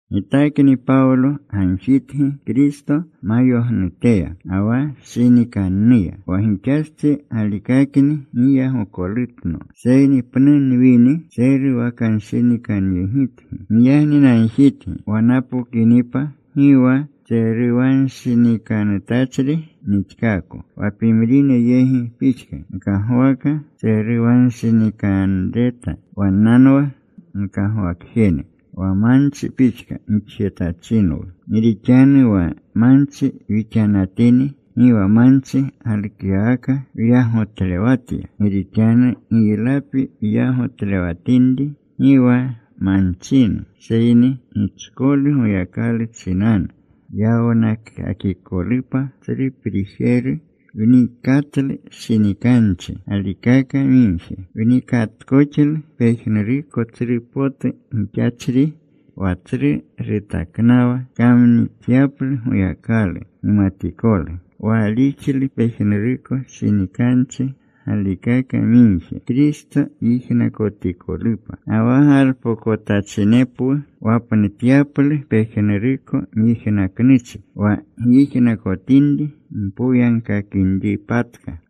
Gitakni Pawlo gagjitgi, Kristo mayognuteya ga wa shinikannuya. Wa gixastsi galikakni giyagolutno. Seyni pnu nwini ntseruwanshinikanyegitgi. Giyagni nagjitgi wa napokinipa gi wa tseruwanshikanutachri nixkaako, wa pimrine yegi pixka nkagwaka tseruwanshinikanreta. Wannanwa wkagwakjene wa manchi pixka gixjetachinwu. Gi rixanu wa manchi wixanatini, gi wa manchi galukyawaka wyagotlewatya. Gi rixanu giylapi wuylalewatinri gi wa manchinu, seyni gichkolu Goyakalu chinanu yawnakakikolupa tsru prijeru. Wnikatlu shinikanchi galikaka migje. Wnikatkoxlu pejnuruko tsru potu gixachri wa tsru rutaknawa kamnixyaplu Goyakalu gimatikolu. Waalixlu pejnuruko shinikanchi galikaka migje Kristo yijnakotikolupa. Ga wa galpokotachinepwu wapnutyaplu pejnuruko myijnaknuchi wa gyijnakotinri mpoyagkakinripatka.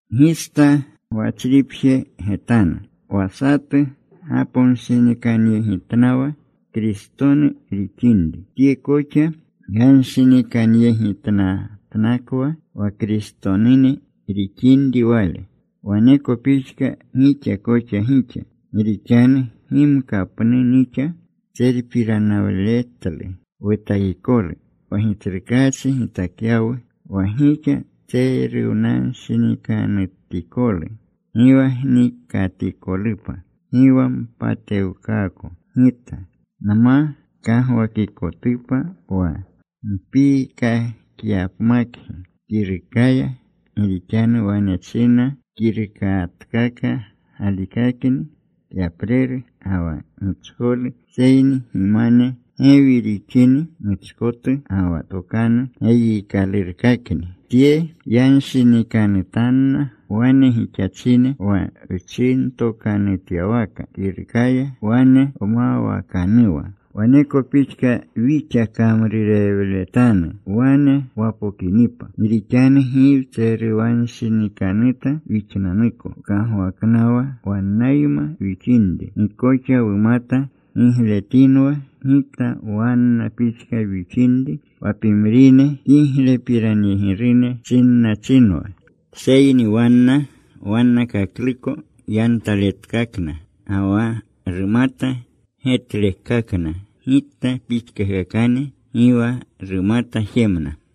Gista gwachripje getanu. Wa satu gaponshinikanyegitnawa Kristonu rixinri, tye koxa yanshinikanyegitnatnakwa, wa Kristonu rixinri wale, waneko pixka wixa koxa wixa. Gi rixanu gimka pnu nixa gitserpiranawletlu wutakikolu, wa Gitsrukaachi gitakyawu wa gixa tseruwakanshinikanutikolu, gi wa gnikatikolupa. Gi wa npatewkaako gita. Nma kagwakikotupa wa npiikakyapmakgi kirukaya. Gi rixanu wane chinna, “Kirukatkaka galikakni kyapreru ga wa gichkolu, seyni gimane gewi rixini muchkotu, ga wa tokanu geyiikalurkakni.” Tye yanshinikanutanna wane gixachine: Wa wchinatokanutyawaka kirukaya wane wmawaknuwa, waneko pixka wixa kamrurewletanu wane wapokinipa. Gi rixanu gi wtseruwanshinikanuta wixnanuko wkagwaknawa wannayma wixinri. Gi koxa wumata getletinwa gikta wanna pixka wixinri, wa pimrine kiglepiranyegirune chinnachinwa. Seyni wanna wannakakluko yantaletkakna ga wa rumata getlekakna gikta pixkakakane. Gi wa rumata jemna.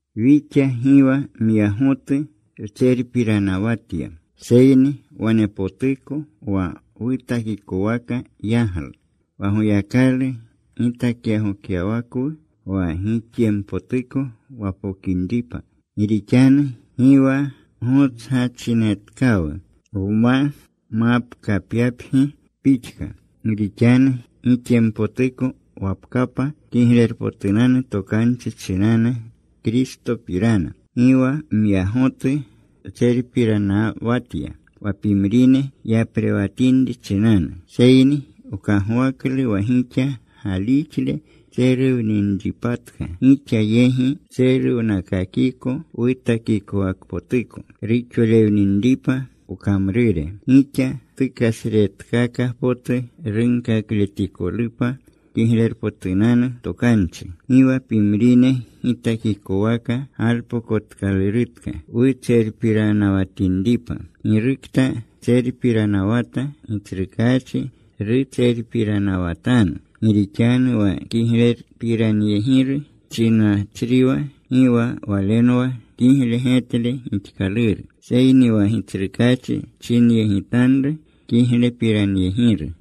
Wixa gi wa myagotu wtserpiranawatya, seyni wanepotuko wa wutakikowaka yaglu, wa Goyakalu gitakyaglutyawakwu, wa gixyempotuko wapokinripa. Gi rixanu gi wa gotsgachinetkawu wma mapkapyapgi pixka, gi rixanu gixyempotuko wapkapa Kiglerpotunanu Tokanchi chinanu Kristopirana. Gi wa myagotu wtserpiranawatya wa pimrine yaprewatinri chinanu. Seyni wkagwaklu wa gixa galixle tseruwninripatka, gixa yegi wtseruwnakakiko wutakikowakpotuko, ruxolewninripa wkamrure, gixa tukasretkaka potu runkakletikolupa Kiglerpotunanu Tokanchi. Gi wa pimrine gitakikowaka galpokotkalurutka wutserpiranawatinripa. Girukta tserpiranawata, Gitsrukaachi rutserpiranawatanu. Gi rixanu wa kiglepiranyegiru chinnachriwa, gi wa walenwa kigle getle gixkaluru, seyni wa Gitsrukaachi chinyegitanru kiglepiranyegiru.